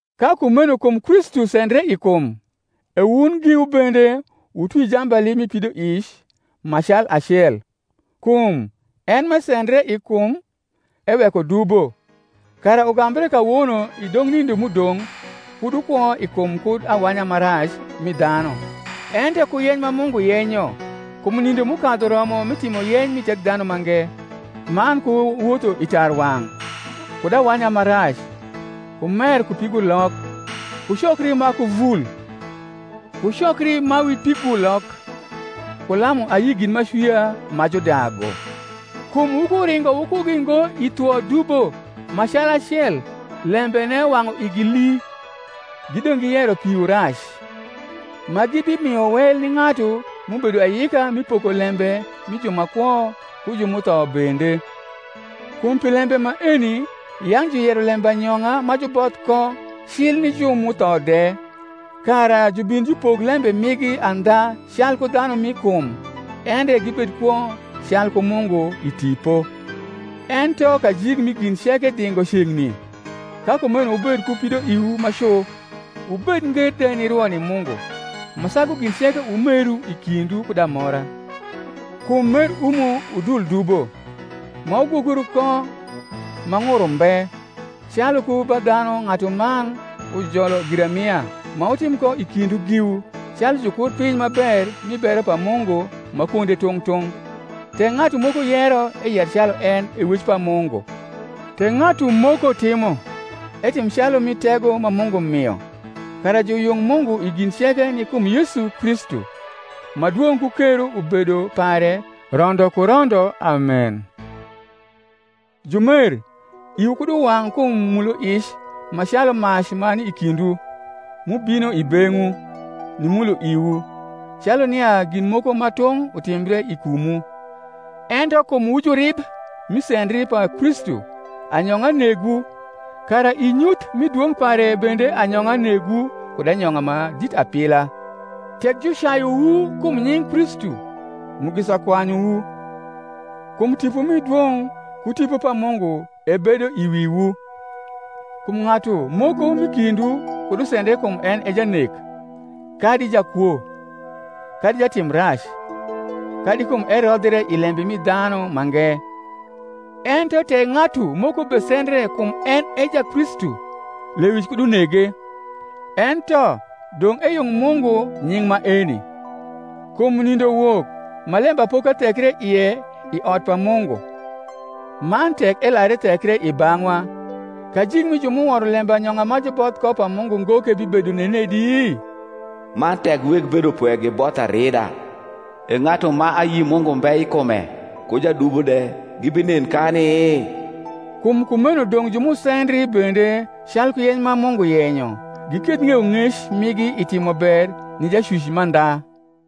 Ka kumeno kum Kristu sendre i kum, e wun giwu bende wutwi jambali mi pidoic ma calacel; kum en m’esendre i kum eweko dubo; kara ugambre kawono i dong nindo m’udong’ kud wukwo i kum kud awanya ma rac mi dhanu, ento ku yeny ma Mungu yenyo. Kum nindo m’ukadhu romo mi timo yeny mi Thekdhanumange, man ku wotho i tarwang’, kud awanya ma rac, ku mer ku pigulok, ku cokri ma ku vul, ku cokri ma wi pigulok, ku lamu ayi gin m’acwia ma judagu: kum wukuringo wukugi ngo i thwo dubo ma calacel lembene wang’u igi hi, gidong’ giyero piwu rac: ma gibimio wel ni ng’atu m’ubedo ayika mi poko lembe mi ju ma kwo ku ju m’utho bende. Kum pi lembe maeni yang’ juyero lembanyong’a ma juboth ko cil ni ju m’utho de, kara jubin jupok lembe migi andha calku dhanu m’i kum, endre gibed kwo calku Mungu i tipo. Ento kajik mi gin ceke dhingo ceng’ni: ka kumeno wubed ku pidoiwu ma cu, wubed nger de ni rwo ni Mungu: ma sagu gin ceke wumeru i kindwu kud amora; kum mer umo udul dubo: ma wugwokru ko ma ng’ur umbe: calu ku ba dhanu ng’atuman ujolo girarnia, ma wutim ko i kindwu giwu, calu jukurpiny ma ber mi bero pa Mungu ma kwonde tung’ tung’; tek ng’atu moko yero, eyer calu en e wec pa Mungu; tek ng’atu moko timo, etim calu mi tego ma Mungu mio: kara juyung Mungu i gin ceke ni kum Yesu Kristu, ma dwong’ ku kero ubedo pare rondo ku rondo. Amen. Jumer, iwu kud uwang’ kum muloic ma calu mac ma ni i kindwu, m’ubino i beng’wu, nimulo iwu, calu nia gin moko ma tung’ utimbre i kumwu: ento kum wu jurib mi sendri pa Kristu, anyong’a negwu; kara i nyuth mi dwong’ pare bende anyong’a negwu kud anyong’a ma dit apila. Tek jucayuwu kum nying’ Kristu, mugisa kwanyuwu; kum Tipo mi dwong’ ku Tipo pa Mungu ebedo i wiwu. Kum ng’atu moko m’i kindwu kud usendre kum en e janek, kadi jakwo, kadi jatim rac, kadi kum erodhre i lembe mi dhanu mange: ento tek ng’atu moko besendre kum en e Jakristu, lewic kud unege; ento dong’ eyung Mungu nying’ maeni. Kum nindo wok ma lembapoka thekre ie i ot pa Mungu: man tek elar ethekre i bang’wa, kajik mi ju m’uworo lembanyong’a ma juboth ko pa Mungu ngo ke bibedo nenedi? Man tek weg bedopwe giboth arida, e ng’atu ma ayi Mungu mbe i kume ku jadubo de gibinen kani? Kum kumeno dong’ ju m’usendri bende calku yeny ma Mungu yenyo giketh ng’eyong’ec migi i timober ni Jacwic mandha.